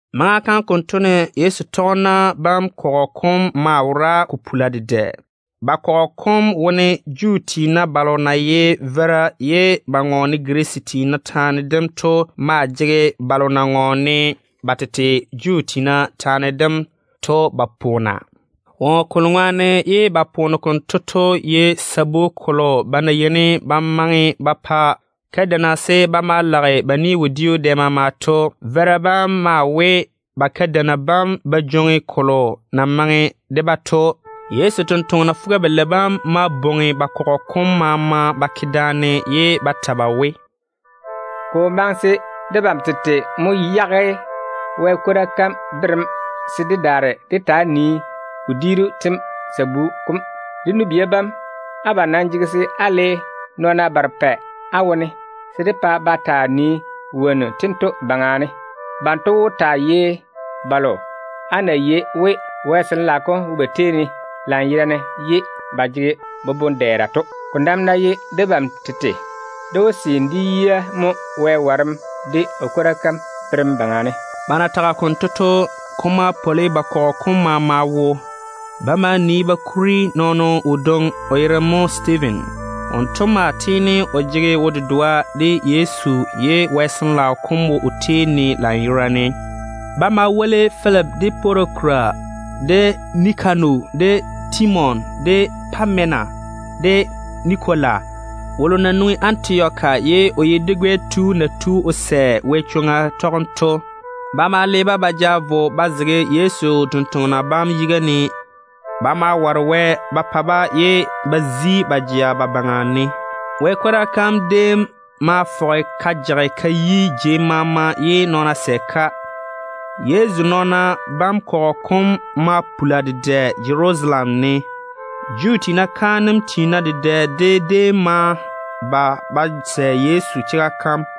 Maŋa kam konto ne Yezu tɔgena bam kɔgɔ kom maa wora ko pula dedɛ. Ba kɔgɔ kom wone Juu tiina balo na ye veira ye ba ŋɔɔne Girisi tiina taane dem to maa jege balo na ŋɔɔne ba tete Juu tiina taane dem to ba poona. Woŋo kolo ŋwaane ye ba poona konto to ye sabu kolo ba na yeini ba maŋe ba pa kadeina se ba maa lage ba ni-wodiu dɛ maama to. Veira bam maa we ba kadeina bam ba jwoŋi kolo na maŋe de-ba to. Yezu tontoŋena fuga-balei bam ma bwoŋi ba kɔgɔ kom maama ba ke daane ye ba ta ba we, “Ko wo maŋe se debam tete mo yage Wɛ kwora kam berem se dé daare dé taa nii wodiiru tem sabu kom. Dé nu-bia bam, abam nam jege se á le nɔɔna barepɛ á wone se dé pa ba taa nii wonnu tento baŋa ne. Banto wó taa ye balo á na yei we Wɛ Sin-laao kom wo ba tei ne lanyerane ye ba jege boboŋ-dɛɛra to. Ko nam ná ye debam tete, dé wó seene dé yia mo Wɛ warem de o kwora kam berem baŋa ne.” Ba na tage konto to, ko ma pwoli ba kɔgɔ kom maama wo. Ba ma nii ba kuri nɔɔno wodwoŋi, o yere mo Stiiven. Wonto maa tiini o jege wo-dedoa de Yezu ye Wɛ Sin-laao kom wo o tei ne lanyerane. Ba ma kuri Filipi, de Porokora, de Nikano, de Timon, de Pamena, de Nikola wolo na nwoŋi Antioka ye o ye dwi-gɛ tu na tu o sɛ Wɛ chwoŋa tɔgem to ba woli da. Ba ma le-ba ba ja vo ba zege Yezu totoŋa nakwa bam yiga ne. Ba ma ware Wɛ ba pa-ba ye ba kwei ba jea ba daŋe ba baŋa ne. Wɛ kwora kam déem ma fɔge ka jage ka yi jei maama. Yezu nɔɔna bam kɔgɔ kom ma puli dedɛ Jerusalem ne. Juu tiina kaanem tiina dedɛ de déem ma ba ba sɛ Yezu chega kam.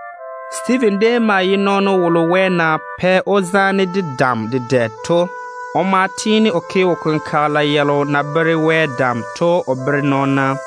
Stiiven déem maa ye nɔɔno wolo Wɛ na pɛ‑o zaane de dam dedɛ to. O tiini o ke wo-kenkagela yalo na bere Wɛ dam to mo o bere nɔɔna.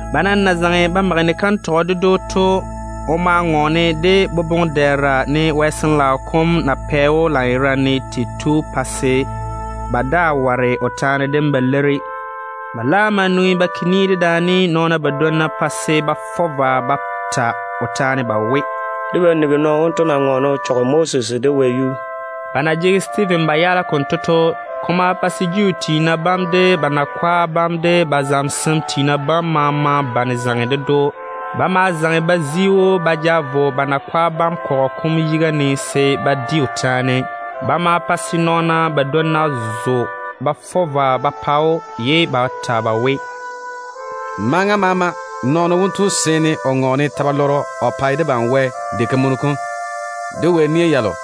Ba nam na zaŋe ba mage ni-kantɔgɔ ded‑o to, o ma ŋɔɔne de swa taane, ne Wɛ Sin-laao kom na pɛ‑o dam tei to, pa se ba daa ware o taane ba leiri. Ba laam ma nwoŋi ba ke ni dedaane nɔɔna badwonna pa se ba fɔ vwa ba ta o taane ba we, “Debam nigi nɔɔno wonto na ŋɔɔne o chɔge Moses de Wɛ yuu.” Ba na jege Stiiven ba yaala konto to, ko ma pa se Juu tiina bam, de ba nakwa bam, de ba zamesem tiina bam maama bane zaŋe ded‑o. Ba ma zaŋe ba zi‑o ba ja vo ba nakwa kɔgɔ kom yiga ne se ba di o taane. Ba ma pa se nɔɔna badwonna zo ba fɔ vwa ba pa‑o, ye ba ta ba we, “Maŋa maama nɔɔno wonto yɔɔre o ŋɔɔne ta-balwaaro o pae Wɛ diga kam, de Wɛ nia yam.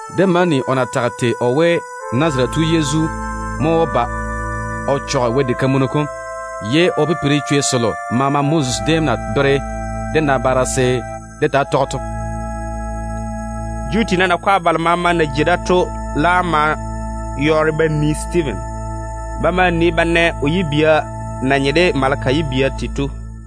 Dé ma ni o na tage tei o we, Nazarete tu Yezu mo wó ba o chɔge Wɛ diga kam, ye o daare o pipiri chwei selo maama Moses déem na bere dé nabaara se dé taa tɔge to.” Juu tiina nakwa balo maama na jei da to laam ma yɔɔre ba nii Stiiven. Ba ma nii ba na o yibia na nye de maleka yibia tei to.